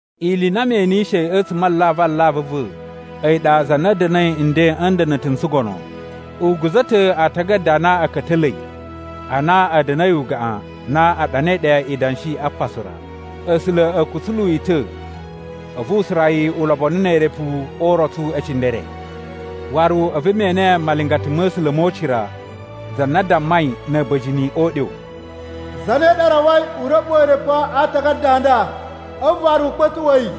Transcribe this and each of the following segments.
Ili i na me enishei a̱tsuma̱ a alavu alavu a̱ va̱ a̱yi ɗa za na da̱na̱i nden a̱ nda̱na̱ta̱ n tsugono, u guza̱ ta̱ aatagada a na a̱ ka̱ta̱la̱i a na a̱ da̱na̱i ugaꞌan na a ɗanai ɗe idanshi a pasu ra. A̱sula̱ a̱ kutsulu yi ta̱ a̱vu u sura yi ulobonu ne erepu o urotsu e cindere. Waru a̱vu me ene malingata ma̱ A̱sula̱ mo ucira, za na dammai na̱ a̱ba̱jini o uɗyo: “Zane ɗa rawai u ra̱ɓuwa̱ erepu a aatagada a nda a̱vu waru u kpa̱tuꞌwa̱ yi?”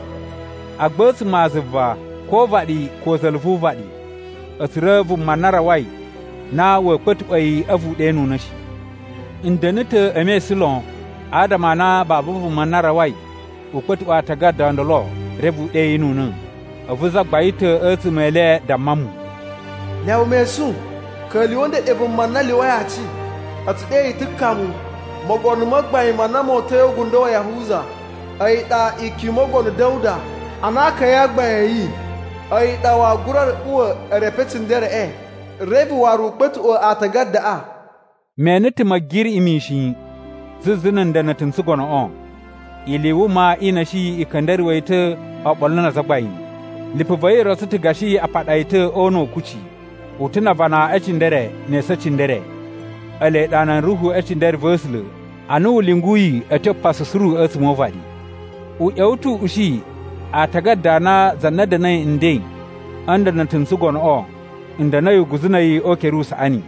Agba a̱tsuma̱ a zuva ko o uvaɗi ko za̱la̱ vu uvaɗi a̱ tsura̱ vuma na rawai na wa̱a̱ kpa̱tuꞌwa̱ yi a̱vu u ɗenuna̱ shi. N da̱na̱ ta̱ e mesun lon, adama a na babu vuma na rawai u kpa̱tuꞌwa̱ aatagada o ndolo reve u ɗeyinuna̱. A̱vu zagbain ta̱ a̱tsuma̱ e le damma mu, “Lyawa mesun! Ka̱lyuwa̱, ndeɗe vuma na lyuwai aci. A̱ tsu ɗe yi ta̱ Kamu, mogono ma gbain ma na mo uta̱i o ugundo wa Yahuza. A̱yi ɗa ikyun i Mogono Da̱wuda ana akaya a gbain a̱ yi. A̱yi ɗa waa gura ra̱ɓuwa̱ erepu e cindereꞌe reve waru u kpa̱tuꞌwa̱ aatagadaꞌa.” Me ene ta̱ Ma̱giriꞌi mishin zuzu na̱ nda̱na̱ta̱ n tsugonoꞌo. Ili i wuma i na̱shi i ka̱nda̱ruwa̱ yi ta̱ oɓolo na azagbain. Lipu va̱ yi rotso ta̱ gashi a paɗa yi ta̱ o una̱ u kucci. U ta̱ na avana e cindere ne esu e cindere, ele ɗa nan ruhu e cindere va̱ A̱sula̱ a na u lyunguyi a̱ tyo pasu suru a̱tsuma̱ o uvaɗi. U ꞌya̱wa̱ ta̱ u ushi aatagada a na za na da̱na̱i nden a̱ nda̱na̱ta̱ n tsugonoꞌo n da̱na̱i uguzu na̱ a̱yi o ukere usaꞌani.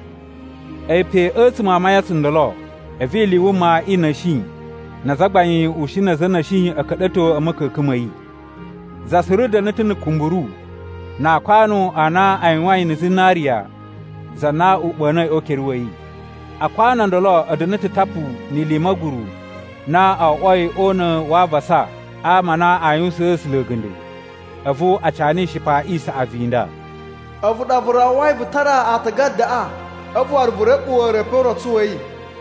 A̱yi pe a̱tsuma̱ a mayan tsundolo, a̱vu ili i wuma i na̱shi na azagbain ushin na̱ a̱za̱ a̱ na̱shi a̱ ka̱ɗa̱to a̱ ma̱ka̱ka̱n ma̱ yi. Za suru da̱na̱ ta̱ na̱ kumburu na aakwanu a na a yuwain na̱ zinariya za na u ɓa̱na̱i o ukere wa̱ yi. Akwanu o ndolo a̱ da̱na̱ ta̱ tapu ni ili i ma̱guru na o oꞌwoi o una̱ wa avasa a ama a na aa yuwusaan A̱sula̱ a̱ga̱nda̱. A̱vu a cana ishipa i saꞌavu i nda: “A̱vu ɗa vu rawai vu tara aatagadaꞌa a̱vu waru vu ra̱ɓuwa̱ erepu o urotsu wa̱ yi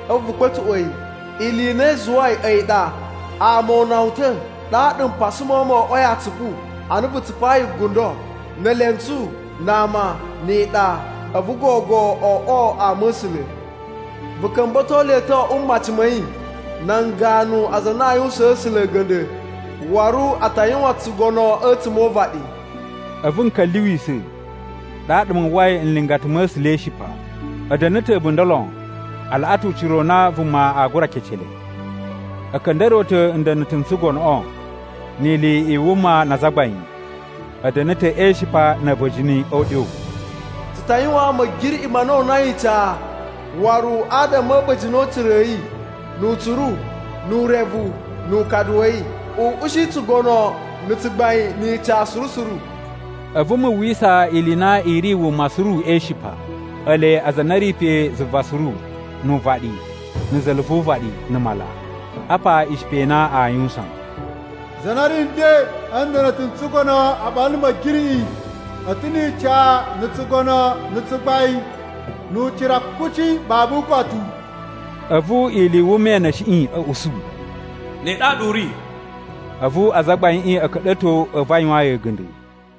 a̱vu vu kpa̱tuꞌwa̱ yi. Ili i na i zuwai a̱yi ɗa ama o una wu ta̱, ɗaɗa mpasa ma̱ wu mo oꞌwoi atsupu ana vu tsupayi gundo, ne elentsu, na ama, ni iɗa, a̱vu gogo o oꞌwo ama a̱ A̱sula̱. Vu ka̱mba̱to le ta̱ o oꞌwo mmaci ma̱ yi nan ganu aza a na a yuwusaan A̱sula̱ a̱ga̱nda̱. Waru a ta yuwan tsugono a̱tsuma̱ o uvaɗi.” A̱vu n ka̱lyuwisa̱, ɗaɗa mu uwwai nlingata ma̱ A̱sula̱ e ishipa. A̱ da̱na̱ ta̱ a̱bunda̱ lon a laꞌa ta̱ ucira u na vuma a gura kece le. A̱ ka̱nda̱ruwa̱ ta̱ nda̱na̱ta̱ n tsugonoꞌo, ni ili i wuma na azagbain. A̱ da̱na̱ ta̱ e ishipa na̱ a̱ba̱jini o uɗyo: “Tsu ta yuwaan Ma̱giriꞌi ma na o unai ica, waru adama a̱ a̱ba̱jini o ucira a̱ yi, nu utsuru, nu urevu, nu ukadu wa̱ yi. U ushi tsugono na̱ tsugbain ni ica suru suru!” A̱vu mu uwwisa ili i na i ri wuma suru e ishipa, ele aza a na a̱ ri pe zuva suru, nu uvaɗi, na̱ za̱la̱ vu uvaɗi, na̱ mala. Apa ishipa i na aa yuwusan: “Za na ri nden a̱ nda̱na̱ta̱ n tsugono oɓolo na̱ Ma̱giriꞌi a̱ ta̱ ni ica na̱ tsugono na̱ tsugbain nu ucira kuci babu ukotu.” A̱vu ili i wuma i na̱shiꞌi a̱ usu, “Ne ɗaɗa u ri!” A̱vu azagbaiꞌin a̱ ka̱ɗa̱to a̱vu a yuwaan yi a̱ga̱nda̱.